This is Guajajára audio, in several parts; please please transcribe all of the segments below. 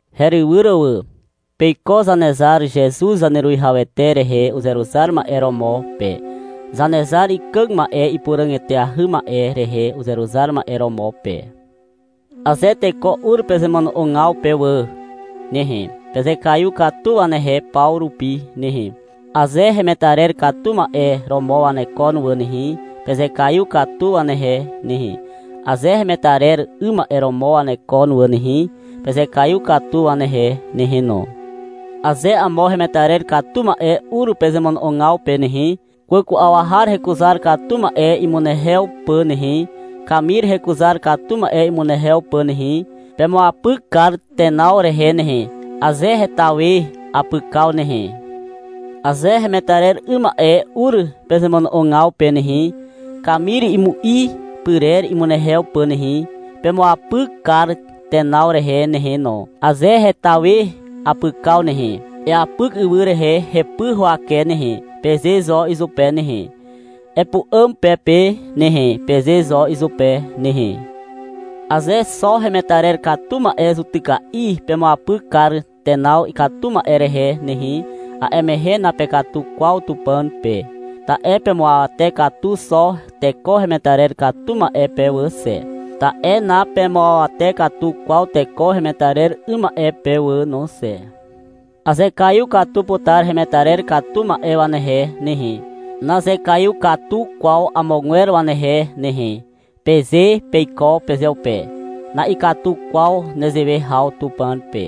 Herywyr wà. Peiko Zanezar Zezuz Zaneruwihawete rehe uzeruzar ma'e romo pe, Zanezar ikàg ma'e ipuràg eteahy ma'e rehe uzeruzar ma'e romo pe. Aze teko ur pezemono'ogaw pe wà nehe, pezekaiw katu wanehe paw rupi nehe. Aze hemetarer katu ma'e romo wanekon wà nehe, pezekaiw katu wanehe nehe. Aze hemetarer 'ym ma'e romo wanekon wà nehe, pezekaiw katu wanehe nehe no. Aze amo hemetarer katu ma'e ur pezemono'ogaw pe nehe, kwàku'aw har hekuzar katu ma'e imunehew pà nehe, kamir hekuzar katu ma'e imunehew pà nehe, pemuapyk kar tenaw rehe nehe, aze heta we apykaw nehe. Aze hemetarer 'ym ma'e ur pezemono'ogaw pe nehe, kamir imu'i pyrer imunehew pà nehe, pemuapyk kar tenaw rehe nehe no, aze heta we apykaw nehe. — Eapyk ywy rehe hepy huwake nehe, peze zo izupe nehe. Epu'àm pe pe nehe, peze zo izupe nehe. Aze xo hemetarer katu ma'e zutyka'i pemuapyk kar tenaw ikatu ma'e rehe nehe, a'e mehe napekatu kwaw Tupàn pe. Ta'e pemuawate katu xo teko hemetarer katu ma'e pe wà xe. Ta'e napemuawate katu kwaw teko hemetarer 'ym ma'e pe wà no xe. — Azekaiw katu putar hemetarer katu ma'e wanehe nehe, nazekaiw katu kwaw amogwer wanehe nehe, peze peiko pezeupe. Na'ikatu kwaw nezewe haw Tupàn pe.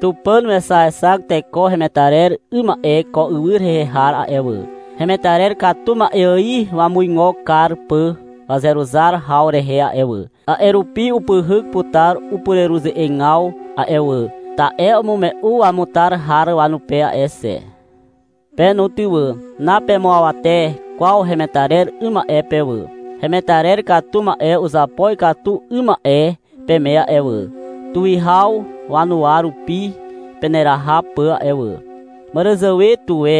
Tupàn wexaexak teko hemetarer 'ym ma'e ko ywy rehe har a'e wà, hemetarer katu ma'e ài wamuigo kar pà wazeruzar haw rehe a'e wà. A'e rupi upyhyk putar upureruze'egaw a'e wà, ta'e umume'u wamutar har wanupe a'e xe. Pe no ty wà. Napemuawate kwaw hemetarer 'ym ma'e pe wà. Hemetarer katu ma'e uzapo ikatu 'ym ma'e peme a'e wà, tuwihaw wanuwa rupi peneraha pà a'e wà. Màràzàwe tuwe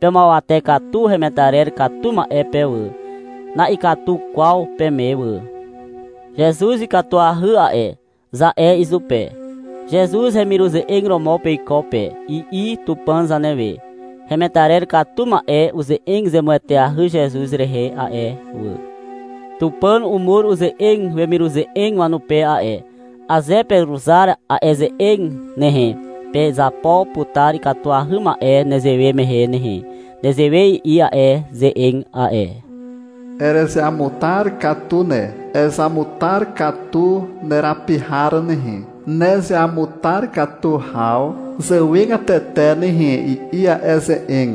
pemuawate katu hemetarer katu ma'e pe wà. Na'ikatu kwaw peme wà. — Zezuz ikatuahy a'e, za'e izupe. Zezuz hemiruze'eg romo peiko pe, i'i Tupàn zanewe. Hemetarer katu ma'e uze'eg zemueteahy Zezuz rehe a'e wà. Tupàn umur uze'eg wemiruze'eg wanupe a'e. Aze peruzar a'e ze'eg nehe, pezapo putar ikatuahy ma'e nezewe mehe nehe. Nezewe i'i a'e ze'eg a'e. — Erezeamutar katu ne. Ezamutar katu nerapi har nehe, nezeamutar katu haw zàwegatete nehe, i'i a'e ze'eg.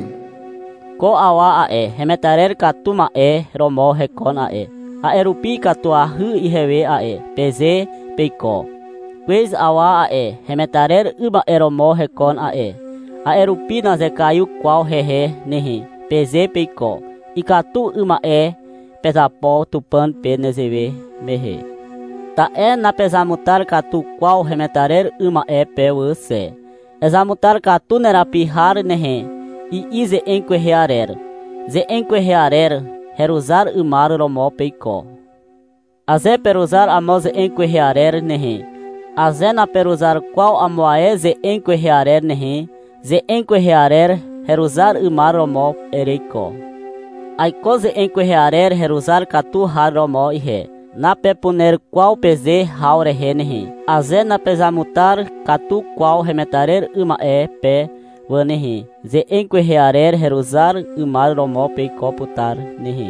— Ko awa a'e, hemetarer katu ma'e romo hekon a'e, a'e rupi ikatuahy ihewe a'e, peze peiko. — Kwez awa a'e, hemetarer 'ym ma'e romo hekon a'e, a'e rupi nazekaiw kwaw hehe nehe, peze peiko. Ikatu 'ym ma'e pezapo Tupàn pe nezewe mehe. Ta'e napezamutar katu kwaw hemetarer 'ym ma'e pe wà xe. — Ezamutar katu nerapi har nehe, i'i ze'eg kwehe arer. Ze'eg kwehe arer heruzar 'ymar romo peiko. Aze peruzar amo ze'eg kwehe arer nehe, aze naperuzar kwaw amo ae ze'eg kwehe arer nehe, ze'eg kwehe arer heruzar 'ymar romo ereiko. — Aiko ze'eg kwehe arer heruzar katu har romo ihe, napepuner kwaw peze haw rehe nehe. Aze napezamutar katu kwaw hemetarer 'ym ma'e pe wà nehe, ze'eg kwehe arer heruzar 'ymar romo peiko putar nehe.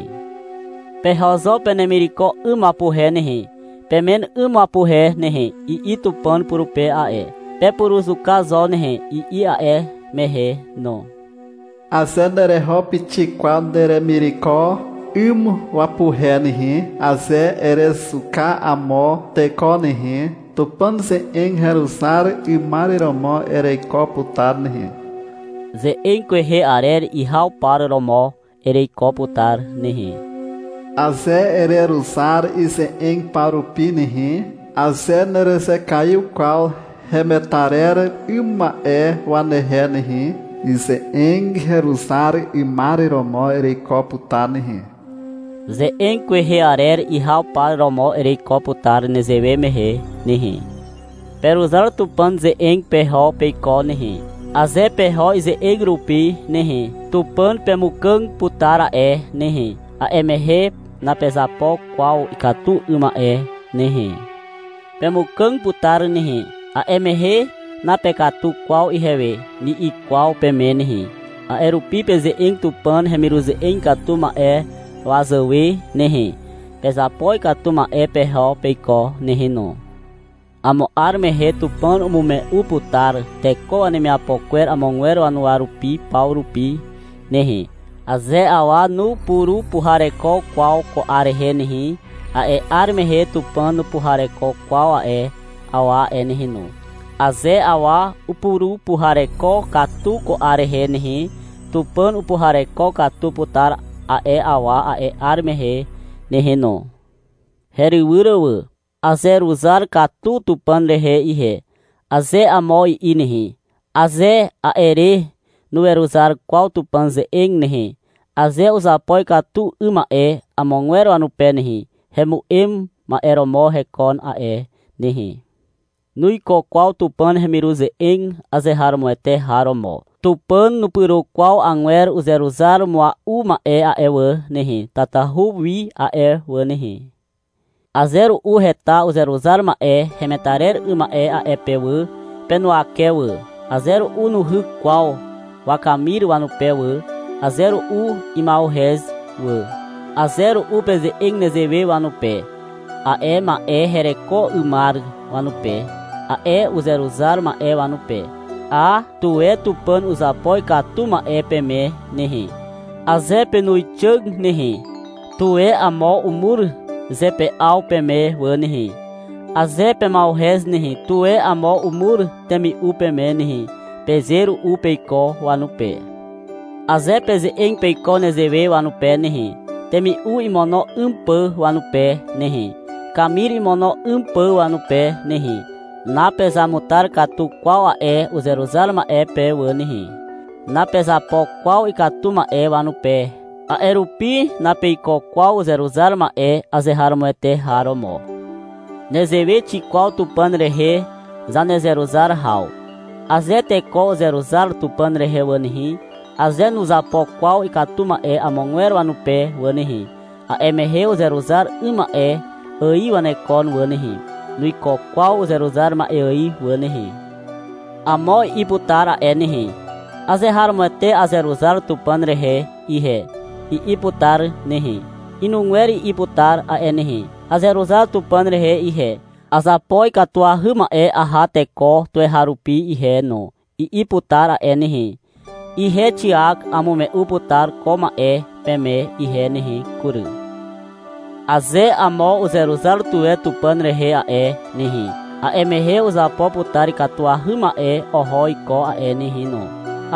— Peho zo penemireko 'ym wapuhe nehe, pemen 'ym wapuhe nehe, i'i Tupàn purupe a'e. — Pepuruzuka zo nehe, i'i a'e mehe no. Aze nereho pixik kwaw neremireko 'ym wapuhe nehe, aze erezuka amo teko nehe, Tupàn ze'eg heruzar 'ymar romo ereiko putar nehe. Ze'eg kwehe arer ihaw par romo ereiko putar nehe. Aze ereruzar ize'eg paw rupi nehe, aze nerezekaiw kwaw hemetarer 'ym ma'e wanehe nehe, ize'eg heruzar 'ymar romo ereiko putar nehe. Ze'eg kwehe arer ihaw par romo ereiko putar nezewe mehe nehe. Peruzar Tupàn ze'eg peho peiko nehe. Aze peho ize'eg rupi nehe, Tupàn pemukàg putar a'e nehe. A'e mehe napezapo kwaw ikatu 'ym ma'e nehe. Pemukàg putar nehe, a'e mehe — Napekatu kwaw ihewe, ni'i kwaw peme nehe. A'e rupi peze'eg Tupàn hemiruze'eg ikatu ma'e wazàwe nehe. Pezapo ikatu ma'e peho peiko nehe no. Amo 'ar mehe Tupàn umume'u putar teko wanemiapo kwer amogwer wanuwa rupi paw rupi nehe. Aze awa nupurupuhareko kwaw ko 'ar rehe nehe, a'e 'ar mehe Tupàn nupuhareko kwaw a'e awa a'e nehe no. Aze awa upurupuhareko katu ko 'ar rehe nehe, Tupàn upuhareko katu putar a'e awa a'e 'ar mehe nehe no. Herywyr wà. — Azeruzar katu Tupàn rehe ihe, aze amo i'i nehe, aze a'e re nuweruzar kwaw Tupàn ze'eg nehe, aze uzapo ikatu 'ym ma'e amogwer wanupe nehe, hemu'em ma'e romo hekon a'e nehe. Nuiko kwaw Tupàn hemiruze'eg azeharomoete har romo. Tupàn nupyro kwaw agwer uzeruzar mua'u ma'e a'e wà nehe, tatahu wi a'e wà nehe. Aze ru'u heta uzeruzar ma'e hemetarer 'ym ma'e a'e pe wà, penuwake wà. Aze ru'u nuhyk kwaw wakamir wanupe wà. Aze ru'u ima'uhez wà. Aze ru'u peze'eg nezewe wanupe, a'e ma'e hereko 'ymar wanupe, a'e uzeruzar ma'e wanupe. — A, tuwe Tupàn uzapo ikatu ma'e peme nehe. Aze penuwixàg nehe, tuwe amo umur zepe'aw peme wà nehe. Aze pema'uhez nehe, tuwe amo umur temi'u peme nehe, peze ru'u peiko wanupe. Aze peze'eg peiko nezewe wanupe nehe, temi'u imono 'ym pà wanupe nehe, kamir imono 'ym pà wanupe nehe, napezamutar katu kwaw a'e uzeruzar ma'e pe wà nehe. Napezapo kwaw ikatu ma'e wanupe, a'e rupi napeiko kwaw uzeruzar ma'e azeharomoete har romo. Nezewe xikwaw Tupàn rehe zanezeruzar haw. Aze teko uzeruzar Tupàn rehe wà nehe, aze nuzapo kwaw ikatu ma'e amogwer wanupe wà nehe, a'e mehe uzeruzar 'ym ma'e ài wanekon wà nehe. Nuiko kwaw uzeruzar ma'e ài wà nehe. Amo i'i putar a'e nehe. — Azeharomoete azeruzar Tupàn rehe ihe, i'i putar nehe. Inugwer i'i putar a'e nehe. — Azeruzar Tupàn rehe ihe, azapo ikatuahy ma'e aha teko tuweharupi ihe no, i'i putar a'e nehe. Ihe Xiak amume'u putar ko ma'e peme ihe nehe kury. — Aze amo uzeruzar tuwe Tupàn rehe a'e nehe, a'e mehe uzapo putar ikatuahy ma'e oho iko a'e nehe no.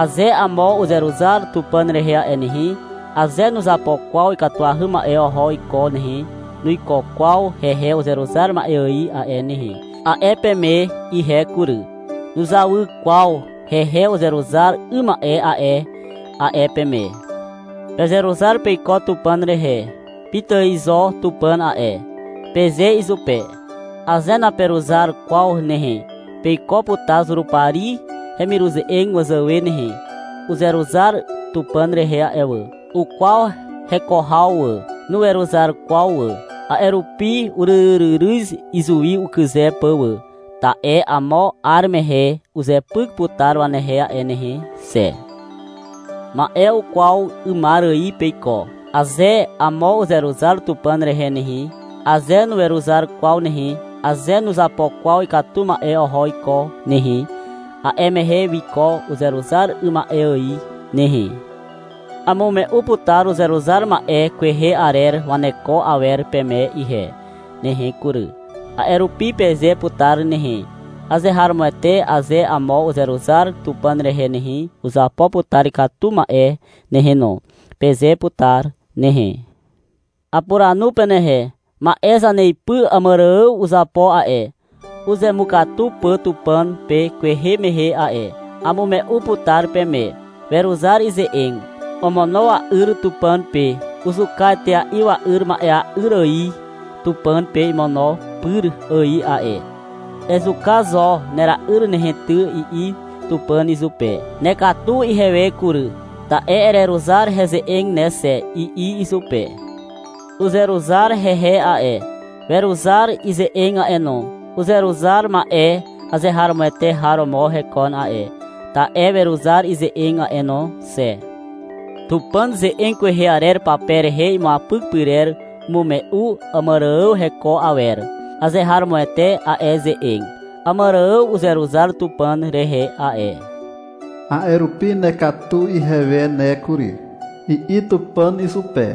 Aze amo uzeruzar Tupàn rehe a'e nehe, aze nuzapo kwaw ikatuahy ma'e oho iko nehe, nuiko kwaw hehe uzeruzar ma'e ài a'e nehe, a'e peme ihe kury. — Nuzawy kwaw hehe uzeruzar 'ym ma'e a'e, a'e peme. Pezeruzar peiko Tupàn rehe. — Pitài zo Tupàn a'e, peze izupe. Aze naperuzar kwaw nehe, peiko putar Zurupari hemiruze'eg wazàwe nehe. Uzeruzar Tupàn rehe a'e wà. Ukwaw heko haw wà. Nuweruzar kwaw wà. A'e rupi uryryryryz izuwi ukyze pà wà. Ta'e amo 'ar mehe uzepyk putar wanehe a'e nehe xe. Ma'e kwaw 'ymar ài peiko. Aze amo uzeruzar Tupàn rehe nehe, aze nuweruzar kwaw nehe, aze nuzapo kwaw ikatu ma'e oho iko nehe, a'e mehe wiko uzeruzar 'ym ma'e ài nehe. Amume'u putar uzeruzar ma'e kwehe arer waneko awer peme ihe nehe kury. A'e rupi peze putar nehe, — Azeharomoete aze amo uzeruzar Tupàn rehe nehe, uzapo putar ikatu ma'e nehe no, peze putar nehe. Apuranu penehe. Ma'e zaneipy Àmàrààw uzapo a'e, uzemukatu pà Tupàn pe kwehe mehe a'e. Amume'u putar peme. Weruzar ize'eg. Omono wa'yr Tupàn pe. Uzuka etea'i wa'yr ma'ea'yr ài Tupàn pe imono pyr ài a'e. — Ezuka zo nera'yr nehe ty, i'i Tupàn izupe. — Nekatu ihewe kury, ta'e ereruzar heze'eg ne xe, i'i izupe. Uzeruzar hehe a'e. Weruzar ize'eg a'e no. Uzeruzar ma'e azeharomoete har romo hekon a'e, ta'e weruzar ize'eg a'e no xe. Tupàn ze'eg kwehe arer pape rehe imuapyk pyrer umume'u Àmàrààw heko awer. Azeharomoete a'e ze'eg. — Àmàrààw uzeruzar Tupàn rehe a'e. A'e rupi — Nekatu ihewe ne kury, i'i Tupàn izupe,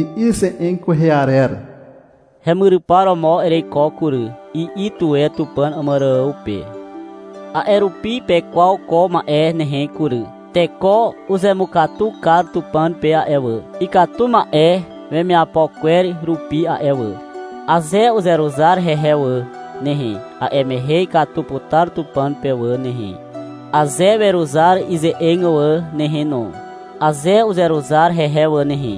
i'i ze'eg kwehe arer. — Hemyrypar romo ereiko kury, i'i tuwe Tupàn Àmàrààw pe. A'e rupi pekwaw ko ma'e nehe kury. Teko uzemukatu kar Tupàn pe a'e wà, ikatu ma'e wemiapo kwer rupi a'e wà. Aze uzeruzar hehe wà nehe, a'e mehe ikatu putar Tupàn pe wà nehe, aze weruzar ize'eg wà nehe no. Aze uzeruzar hehe wà nehe,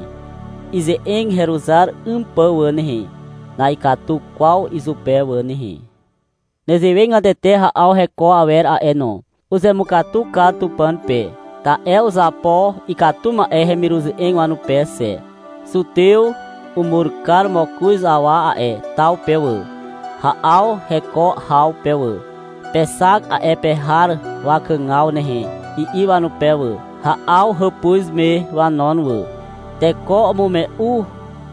ize'eg heruzar 'ym pà wà nehe, na'ikatu kwaw izupe wà nehe. Nezewegatete Ha'aw heko awer a'e no. Uzemukatu kar Tupàn pe, ta'e uzapo ikatu ma'e hemiruze'eg wanupe xe. Zutew umur kar mokoz awa a'e taw pe wà, Ha'aw heko haw pe wà. — Pexak a'e pe har wakàgaw nehe, i'i wanupe wà. Ha'aw hàpuz me wanon wà. Teko umume'u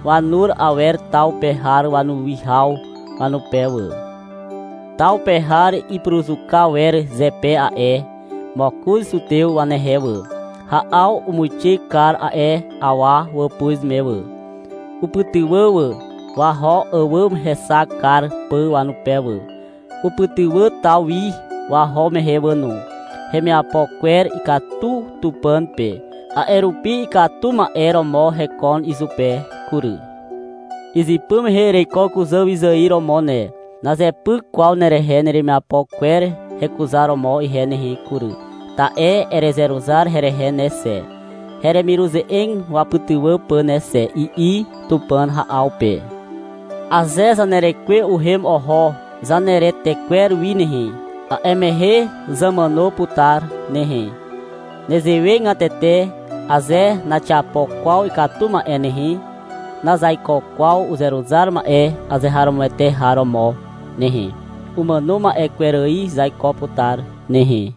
wanur awer taw pe har wanuwihaw wanupe wà. Taw pe har ipuruzuka wer zepe a'e mokoz zutew wanehe wà. Ha'aw umuixe kar a'e awa wàpuz me wà. Upytywà wà, waho àwàm hexak kar pà wanupe wà. Upytywà taw wi waho mehe wà no. Hemiapo kwer ikatu Tupàn pe. A'e rupi ikatu ma'e romo hekon izupe kury. — Izypy mehe ereiko kuzàwyzài romo ne. Nazepyk kwaw nerehe neremiapo kwer hekuzaromo ihe nehe kury, ta'e erezeruzar herehe ne xe, heremiruze'eg wapytywà pà ne xe, i'i Tupàn Ha'aw pe. Aze zanerekwe uhem oho zaneretekwer wi nehe, a'e mehe zamàno putar nehe. Nezewegatete aze naxiapo kwaw ikatu ma'e nehe, nazaiko kwaw uzeruzar ma'e azeharomoete har romo nehe. Umàno ma'e kwer ài zaiko putar nehe.